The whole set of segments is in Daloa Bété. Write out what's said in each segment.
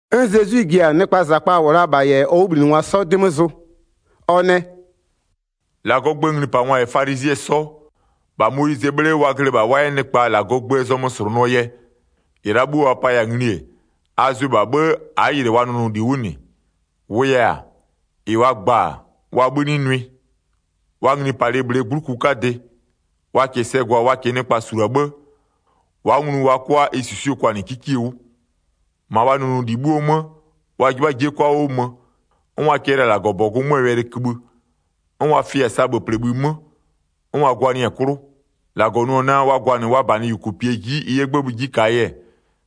'N Zezwi ji-a nɩkpaa -zakpa -wʋ la-a -bha -yɛ ɔ 'wʋbhlinɩngwa 'sɔ 'dɩ 'mö zʋ. Ɔ nɛ: “-Lagɔɔ gböö nglipangwa -yɛ falizɩɛ 'sɔ, -bha Moyizɩɛ 'bhle 'wʋ wa glɩ -bha wa 'yɛ nɩkpa -Lagɔɔ gböö zɔmö -slʋnʋɔ yɛ. 3-Ɩ la'a 'bhuo wa paya-a ngli-e, a zʋɩ -bha 'bhë, a'a yɩlɩ wa nʋnʋli 'wʋ -nɩ. -Wʋʋ yɛ-a, -ɩ wa gba-a, wa 'bhï 'nɩ nʋɩ. Wa nglipalɩ -bhlee 'gbluku 'kadɩ, wa -kɩɩ sɛ gwa wa -kɩɩ nɩkpa -sulua 'bhë, wa'a nglu wa 'kʋa ɩ -susuie kwanɩ 'kikie 'wʋ. 5-Ma wa nʋnʋli 'bhuo 'mö, wa 'jɩbha 'jie 'kʋa 'wʋ mö. 'N wa cɛlɩ-a -Lagɔbɔgʋ 'möö wɛlɩkïbhï, 'n wa fɩ-a sabhöplebhï 'mö, 'n wa gwanɩɩ-a 'klʋ. -Lagɔ nʋ-ɔ naa wa gwanɩ wa -banɩ -yʋkʋpie 'ji ɩ 'yɛ 'gbëbhï 'ji -kaa yɛ,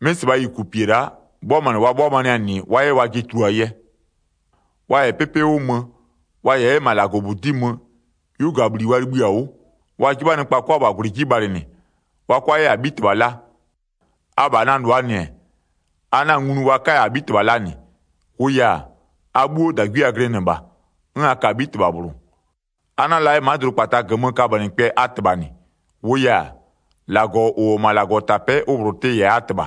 'mɩ -sɩbhaa -yʋkʋpie la'a 'bhʋamanɩ wa 'bhʋamanɩɩ-a -nɩ wa 'yɛ wajɩ tuluaa yɛ. Wa -yɛ 'pɩpɩ 'wʋ mö, wa -yɛ 'yɛ -ma -Lagɔbudi'i mö, 'yugabhli wa libhï-a 'wʋ. Wa 'jɩbha nɩkpa 'kʋa -bha -gwlɩ 'ji bhalɩnɩ, wa 'kʋa 'yɛ -abhitɩbha la. Abha na -lʋaa -nɩ-ɛ, a 'na-a nglu wa 'kaya -abhitɩbha la -nɩ. -Wʋʋ yɛ-a, a 'bhuo -dagwie a glɩnɩ -bha, 'n a ka-a 'bhitɩbha -bhlʋ. A 'na-a la 'yɛ ma'a dʋdʋkpata -gömö kabönɩkpɛ a -tɩbha -nɩ. -Wʋʋ yɛ-a, -Lagɔ -ʋ -wʋ-ɔ -ma -Lagɔtapɛ'ɛ ʋ -bhlʋ tɩ-ɩ -yɛ-a a -tɩbha.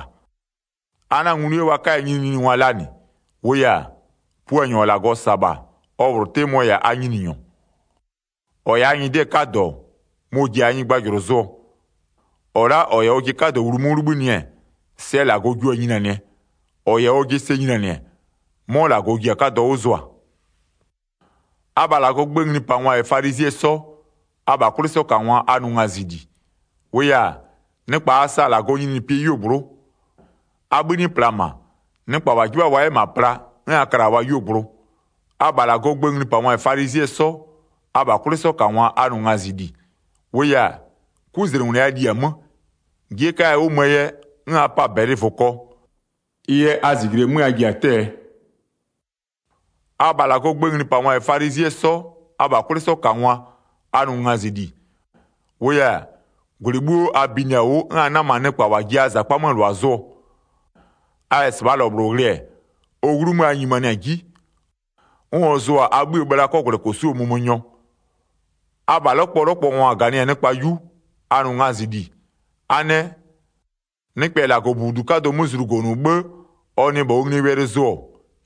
A 'na-a nglu wa 'kaya nyininyiningwa la -nɩ. -Wʋʋ yɛ-a, Puanyɔ -ɔ -Lagɔ -sa-a -bha, ɔ -bhlʋ 'tɩ mɔ-ɔ -yɛ-a a Nyininyɔ. 11-Ɔ -yɛ-a a nyɩdɩɛ 'kadɔ, mɔ-ɔ ji-a nyɩgbajʋlʋ zʋɔ. 12-Ɔ la'a -ɔ -yɛ ɔjɩ 'kadɔ wlu 'mö 'wʋ 'libhinɩ-ɛ, sɛ -Lagɔ jio-a nyinianɩɛ, -ɔ -yɛ ɔjɩ sɛ nyinianɩ-ɛ, 'mɔ -Lagɔ ji-a 'kadɔ 'wʋ zʋa. Abha -Lagɔɔ gböö nglipangwa -yɛ falizɩɛ 'sɔ, abha 'kwlɩsɔkangwa, a nʋ ngazɩli. -Wʋʋ yɛ-a, nɩkpa a sa-a -Lagɔɔ nyininyinipɩɛ 'yuogblʋ'ʋ. A 'bhï 'nɩ pla -ma, nɩkpa -wa 'jɩbha-a wa 'yɛ -ma pla, 'n a kla-a wa 'yuogblʋ. [ Abha -Lagɔɔ gböö nglipangwa -yɛ falizɩɛ 'sɔ, abha 'kwlɩsɔkangwa, a nʋ ngazɩli. -Wʋʋ yɛ-a, 'kuzlengwlɩ a li-a 'mö. 'Jie 'kaya 'wʋ möö yɛ, 'n a pa-a -bɛlɩ -vʋkɔ. Ɩ yɛ a -zijle 'mö a ji-a 'tɛ-ɛɛ.] Abha -Lagɔɔ gböö nglipangwa -yɛ falizɩɛ 'sɔ abha 'kwlɩsɔkangwa, a nʋ ngazɩli. -Wʋʋ yɛ-a, -gwlɩ 'bhuo a binɩ-a 'wʋ 'n a 'nama-a nɩkpa -wa ji-a a -zakpa 'möö -lʋa zʋɔ. A -yɛ -sɩbhaa -lɔ -bhlʋ ghlɩ, ɔ 'wlumö a nyimanɩ-a 'ji, 'n ɔ zʋ-a a 'bhïë bhla 'kɔgwlɛkosu'uo mömönyɔ. Abha 'lɔkpɔlɔkpɔngwa -ganɩ-a nɩkpa 'yu, a nʋ ngazɩli. A nɛ: Nɩkpɛ -yɛ -Lagɔbudu 'kadʋ 'mö zlugonʋ 'bhë ɔ nɩ -bha ɔ nglie wɛlɩ zʋ-ɔ,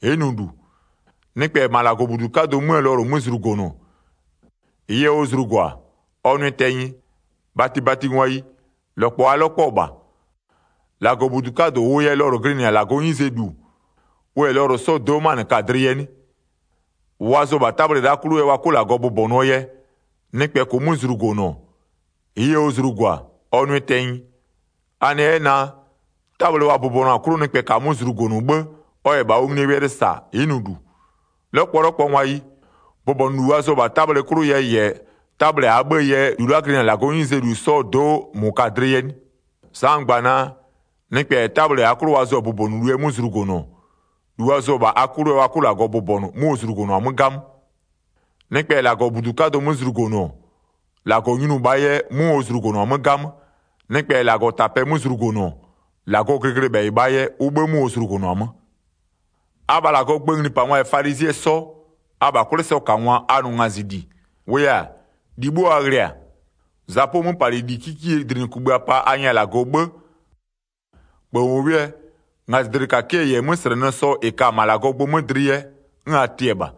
ɩ'ɩ nʋ -lu. Nɩkpɛ -yɛ -ma -Lagɔbudu 'kadʋ 'möö lɔlʋ 'mö zlugonʋ, -ɩɩ yɛ ɔ zlugo-a, ɔ nʋɩ tɛnyɩ. 17-Batibatingwayi, -lɔkpɔ a 'lɔkpɔ-ɔ -bha. -Lagɔbudu 'kadʋ -ʋʋ yɛ lɔlʋ glɩnɩ-a -Lagɔɔ 'nyizee -lu, ʋ -yɛ lɔlʋ 'sɔɔ do'o 'manɩ ka-a dlɩ yɛ 'nɩ? -Ʋ wa zʋ-ɔ -bha 'tabhle la'a 'klʋ yɛ wa 'kʋ -Lagɔ bʋbɔnʋɔ yɛ, nɩkpɛ -kʋʋ 'mö zlugonʋ, -ɩɩ yɛ ɔ zlugo-a, ɔ nʋɩ tɛnyɩ. A nɛ 'yɛ naa: 'Tabhle wa bʋbɔnʋ-a 'klʋ nɩkpɛ -kaa 'mö zlugonʋ 'bhë, ɔ -yɛ -bha ɔ nglie wɛlɩ -sa, ɩ'ɩ nʋ -lu. 'Lɔkpɔlɔkpɔngwayi, bʋbɔnʋlu wa zʋ-ɔ -bha 'tabhle 'klʋ yɛ -yɛ 'tabhle -aa 'bhëë yɛ -lu la'a glɩnɩ-a -Lagɔɔ 'nyizee -lu 'sɔɔ do'o -mʋ ka-a dlɩ yɛ 'nɩ? Sa'a n gba-a naa: Nɩkpɛ -yɛ 'tabhle -aa 'klʋ wa zʋ-a bʋbɔnʋlu yɛ 'mö zlugonʋ, -lu wa zʋ-ɔ -bha a 'klʋ yɛ wa 'kʋ -Lagɔ bʋbɔnʋ 'mʋ ɔ zlugonʋ-a 'mö 'gamö. Nɩkpɛ -yɛ -Lagɔbudu 'kadʋ 'mö zlugonʋ-ɔ, -Lagɔ nyinʋʋ -bhaa yɛ 'mʋ ɔ zlugonʋ-a 'mö 'gamö. Nɩkpɛ -yɛ -Lagɔtapɛ 'mö zlugonʋ-ɔ, -Lagɔɔ glɩglɩbhɛyɩ -bhaa yɛ, ʋ 'bhë 'mʋ ɔ zlugonʋ-a 'mö. Abha -Lagɔɔ gböö nglipangwa -yɛ falizɩɛ 'sɔ, abha 'kwlɩsɔkangwa, a nʋ ngazɩli. -Wʋʋ yɛ-a, -li 'bhuo a ghlɩ-a, zapʋɔ 'möpalɩli 'kikiee -dlinɩkugbïa pa a nyɛ-a -Lagɔ 'bhë, -kpööwʋwʋɛ, ngazɩdlɩkakɩɛ -yɛ 'möslɛnɩslɛnɩɛ 'sɔ -ɩ ka-a -ma -Lagɔɔ gbö 'mö dlɩ yɛ, 'n a tɩɩ-ɛ -bha.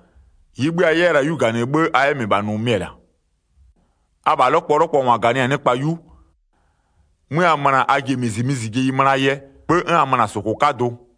-Ɩɩ 'bhï a 'yɛ la-a 'yu -ganɩ 'bhë a 'yɛ -mɩbha nʋ mɩ-ɛ -la. Abha 'lɔkpɔlɔkpɔngwa -ganɩ-a nɩkpa 'yu, 'mö a möna-a a ji-e -mizimizijeyi möna-a yɛ, 'bhë 'n a möna-a -sʋkʋ 'kadʋ.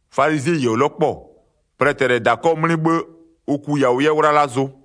Falizɩɛyi -ɔ 'lɔkpɔ-ɔ, plɛtɛ -lɛ -ma -dakɔ 'mlɩ 'bhë, ʋ ku yawʋ 'yɛ 'wlala zʋ.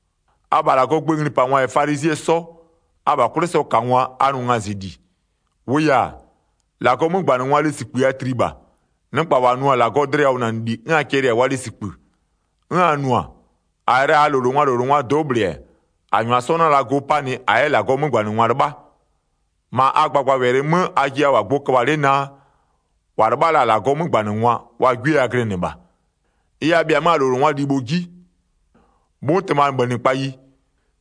Abha -Lagɔɔ gböö nglipangwa -yɛ falizɩɛ 'sɔ, abha 'kwlɩsɔkangwa, a nʋ ngazɩli. -Wʋʋ yɛ-a, -Lagɔɔ 'mögbanɩngwaa lesikpï a tli -bha. Nɩkpa -wa nʋ-a -Lagɔɔ dlɩyawʋnanɩli 'n a cɛlɩ-a wa lesikpï. 'N a nʋ-a, -a -yɛ la -aa -lowlengwaa -lowlengwaa do'o -bhlɩ-ɛ, -a -nyʋa 'sɔ 'na la go 'panɩ -a 'yɛ -Lagɔɔ 'mögbanɩngwa 'lɩbha. 31-Ma a gbagbawɛlɩ 'mö ajɩ a -wʋ-a gbʋ köbha-a 'le naa, -wa 'lɩbha la-a -Lagɔɔ 'mögbanɩngwa, wa 'gwie a glɩnɩ -bha. Ɩ yɛ, a bhɩa-a 'mö a -lowlengwaa libho 'ji. 'Mʋtɩmabhönɩkpayi,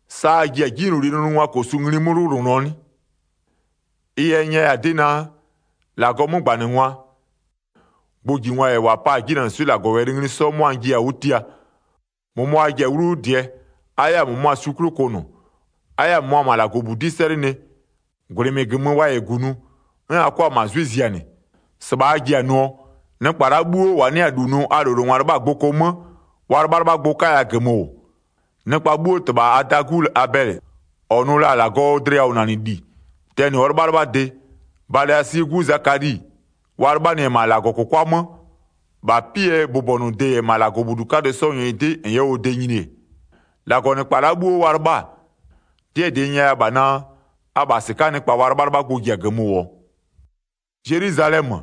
sa a ji-a 'jinylolie nʋnʋngwaa -kosu ngli 'mö 'wlʋwlʋnʋɔ 'nɩ? Ɩ yɛ n nyɛya-a 'dɩ naa: -Lagɔɔ 'mögbanɩngwa, gbʋjingwa -yɛ -wa 'pa-a 'jinanɩswɩ'ɩ -Lagɔwɛlɩ ngli 'sɔ 'mʋa n jiya-a 'wʋ tia. -Mʋmʋa a ji-a 'wlu 'wʋ -dɩɛ, a 'yɛ-a -mʋmʋa swi 'klʋ kʋnʋ, a 'yɛ-a -mʋmʋa -ma a -Lagɔbudi'i 'sɛlɩnɩ, -gwlɩ -mɩɩ -gömö wa -yɛ -gunʋ, 'n a 'kʋa-a -ma 'zwɩ zianɩ. 35-Sɩbha a ji-a nʋɔ, nɩkpa la'a 'bhuo -wa 'nɩ-a -lu nʋ a -lowlengwa 'lɩbha-a gboko 'mö, wa 'lɩbhalɩbhagbʋ 'kaya -gömö -wʋ. Nɩkpa 'bhuoo -tɩbha Adaa 'gu Abɛlɩ -ɔ nʋ la-a -Lagɔɔ dlɩyawʋnanɩli, tɛnɩ ɔ 'lɩbhalɩbhade, Balasie 'gu Zakali, wa 'lɩbhanɩ-ɛ -ma -Lagɔkʋkwa 'mö, -bha 'pɩɛ bʋbɔnʋde -yɛ -ma -Lagɔbudu 'kadʋ 'sɔɔ nyɩdɩ -n 'yɛ ɔ de nyini-e, 36-Lagɔnɩkpa la'a 'bhuo wa 'lɩbha-a, 'dɩɛ -dɩ n nyɛya -bha naa: Abha -sɩka'aa nɩkpa wa 'lɩbhalɩbhagbʋ ji-a -gömö -wʋɔ. Zelwizalɛmö,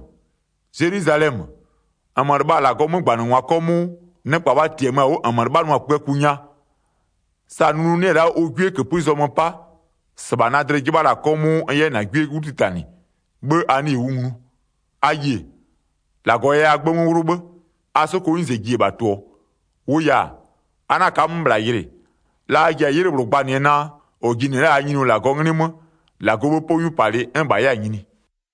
Zelwizalɛmö, -nmö lɩbha-a -Lagɔɔ 'mögbanɩngwa 'kɔmʋʋ, nɩkpa wa -tiamö-a 'wʋ -nmö 'lɩbhanʋa-a kpïaku nya. Sa nunu 'nɩ-ɛ la'a ʋ 'gwie -këpï zɔmö 'pa, -sɩbha na dlɩ 'jɩbha-a 'kɔmʋʋ n 'yɛ -na 'gwie 'wlu 'titanɩ, 'bhë a 'nɩɩ-ɩ 'wʋ nglu. A yie, -Lagɔ yɛ a 'gbë 'mö 'wlʋ 'bhë, a 'sokoo 'nyize ji-e -bha tʋ-ʋɔ. 39-Wʋʋ yɛ-a, a 'na ka'a-a 'mö -bhla yɩlɩ, la a ji-a 'ylɩ -bhlʋ gbanɩɛ naa: -Ɔ jinɩ-ɛ la'a -aa Nyininyɔ -Lagɔɔ 'nglɩ 'mö, -Lagɔɔ 'bhë 'pɔ 'nyupalɩ 'n -bha 'yɛ-a nyini.”